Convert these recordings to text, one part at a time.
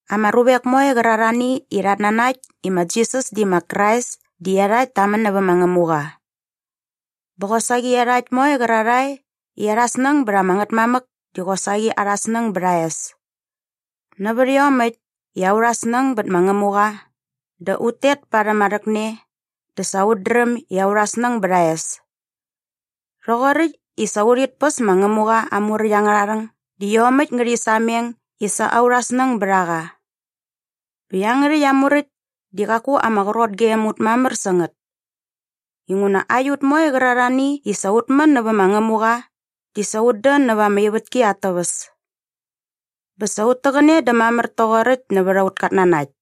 Ama ruvek moe qärarhani i rhat nanakt i ma Jisas di ma Krais di iarhakt ta män nävä ma Ngämuqa. Bä qosaqi iarhakt moe qärarhae i arha snäng bät ama Ngätmamäk di qosaqi arha snäng bät aa es. Nävät iomäkt i aurha snäng bät ma Ngämuqa dä ut tet parhäm aa rhäkne dä sa ut dräm i aurha snäng bät aa es. Rhoqoräkt i sa urhit päs ma Ngämuqa aa muräkt angärha rhäng di iomäkt ngärhi sameng i sa aurha snäng bät a qa. Bä iangärhäkt aa muräkt di qaku ama qrot gem ut mamär sä ngät. Inguna aiut moe qärarhani i sa ut män nävä ma Ngämuqa di sa ut dän näva ama ivätki at täväs. Bä sa ut täqäne dä mamär toqoräkt nävät aut katnanakt.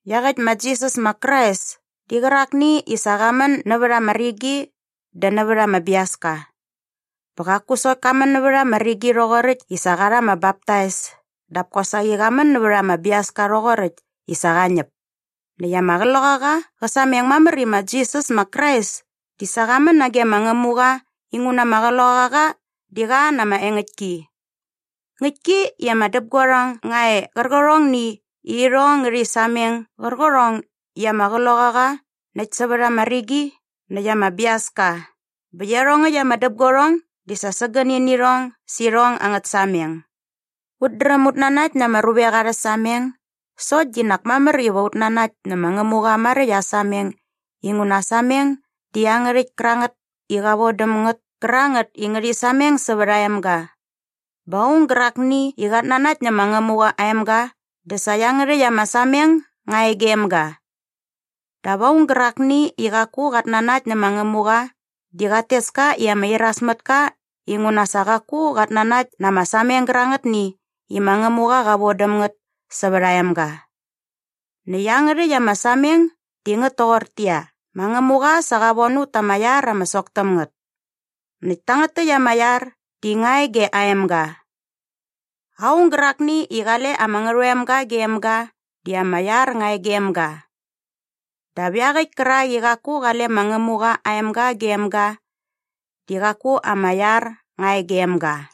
Iaqäkt ma Jisas ma Krais di qärakni i sa qa män nävät ama rigi dä nävät ama biaska. Bä qaku sokt ka män nävät ama rigi rhoqoräkt i sa qa rha ama baptais dap kosaqi qa män nävät ama biaska rhoqoräkt i sa qa ñäp. Näkt ama Qloqaqa qä sameng mamär i ma Jisas ma Krais di sa qa män nage ma Ngämuqa inguna ama Qloqaqa di qa na ama engäktki. Ngäktki i ama däpguarhong nga e qärqärhongni i irhong ngärhi sameng qärqärhong i ama Qloqaqa näkt sävät ama rigi näkt ama biaska bä iarhongäkt ama däpguarhong di sa sägäni nä irhong sä irhong angät sameng. Ut dräm ut nanakt na ama ruvek arhä sameng sokt di nak mamär iva ut nanakt nä ma Ngämuqa maräkt aa sameng inguna aa sameng di iangärhäkt kärangät i qa von däm ngät kärangät i ngärhi sameng sävät aa emga. Bä aung gärakni i qat nanakt nä ma Ngämuqa aa emga dä sa iangärhäkt ama sameng nga e gem ga. Dap aung gärakni i qaku qat nanakt nä ma Ngämuqa di qat tes ka i ama irasmätka inguna sa qaku qat nanakt na ama sameng gärangätni i ma Ngämuqa qa von däm ngät sävät aa emga. Näkt iangärhäkt ama sameng di ngät toqortäqyia, ma Ngämuqa sa qa von ut ta ama iar ama sok täm ngät. Näkt tangät täkt ama iar di nga e ge aa emga. Aung gärakni i qale ama Ngärhoemga gem ga di ama iar nga e gem ga. Dap iaqäkt kärak i qaku qale ma Ngämuqa aa emga gem ga di qaku ama iar nga e gem ga.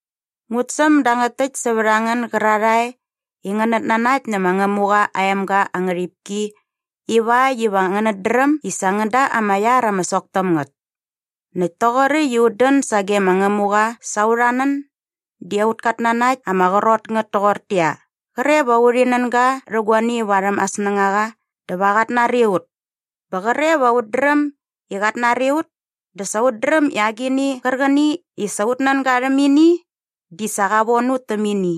Ngut säm dangät täkt sävät a ngän gärarhae i ngänät nanakt nä ma Ngämuqa aa emga aa ngärhipki ivakt iva ngänät dräm i sa ngän da ama iar ama sok täm ngät. Näkt toqoräkt i ut dän sage ma Ngämuqa sa aurha nän di aut katnanakt ama qrot ngät toqortäqyia, qre va urhi nän ga rhä guani varhäm aa snängaqa dä va qat nari ut. Bä qre va ut dräm i qat nari ut dä sa ut dräm i agini qärqäni i sa ut nän ga rhäm ini di sa qa von ut täm ini.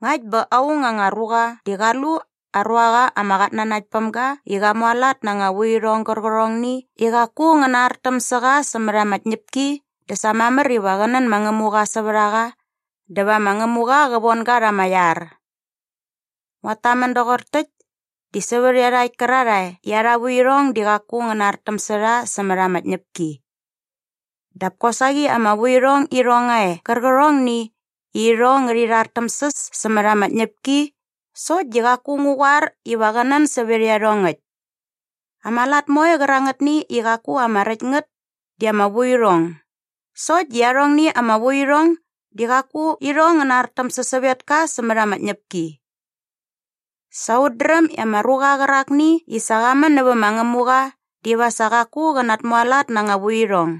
Ngakt bä aung anga ruqa di qa lu aa ruaqa ama qatnanaktpämga i qa mualat na anga vuirhong gärqärhongni i qaku ngä nartäm sä qa sämät ama tñäpki dä sa mamär iva qä nän ma Ngämuqa sävät a qa dä va ma Ngämuqa qä von ga rha ama iar. Nguat tamän doqor täkt di sävät iarhakt kärarhae i arha vuirhong di qaku ngä nartäm sä rha sämät ama tñäpki. Dap kosaqi ama vuirhong irhong nga e qärqärhongni i irhong ngärhi rhartämsäs sämät ama tñäpki sokt di qaku ngu qoar iva qä nän sävät iarhongäkt. Ama lat moe qärangätni i qaku ama räkt ngät di ama vuirhong sokt di arhongni ama vuirhong di qaku irhong ngä nartäm sä sävetka sämät ama tñäpki. Sa ut dräm i ama ruqa qärakni i sa qa män nävä ma Ngämuqa diva sa qaku qä natmualat na anga vuirhong.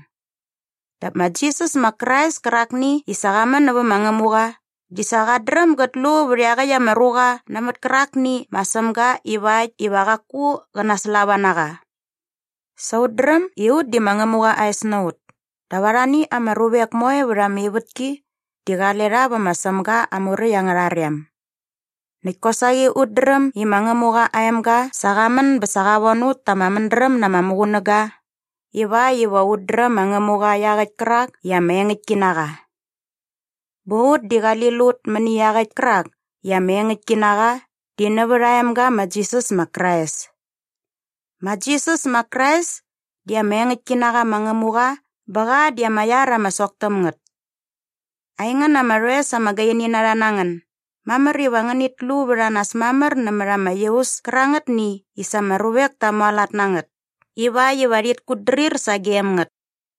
Dap ma Jisas ma Krais kärakni i sa qa män nävä ma Ngämuqa di sa qat dräm gät lu vät iaqäkt ama ruqa nämät kärakni ma Sämga ivakt iva qaku qä naslava na qa. Sa ut dräm i ut di ma Ngämuqa aa es na ut dap arhani ama ruvek moe vät ama ivätki di qale rha vä ma Sämga aa muräkt angärha rem. Näkt kosaqi ut dräm i ma Ngämuqa aa emga sa qa män bä sa qa von ut ta ama mädräm na ama muqunäga ivakt iva ut dräm ma Ngämuqa iaqäkt kärak i ama engäktki na qa. Bä ut di qali lut mäni iaqäkt kärak i ama engäktki na qa di nävät aa emga ma Jisas ma Krais. Ma Jisas ma Krais di ama engäktki na qa ma Ngämuqa bä qa di ama iar ama sok täm ngät. Aingän ama rhoes ama gaini na rha na ngän, mamär iva ngänit lu vät a nas mamär nämät ama iaus kärangätni i sa ama ruvek ta mualat na ngät ivakt iva rhit kutdrir sagem ngät.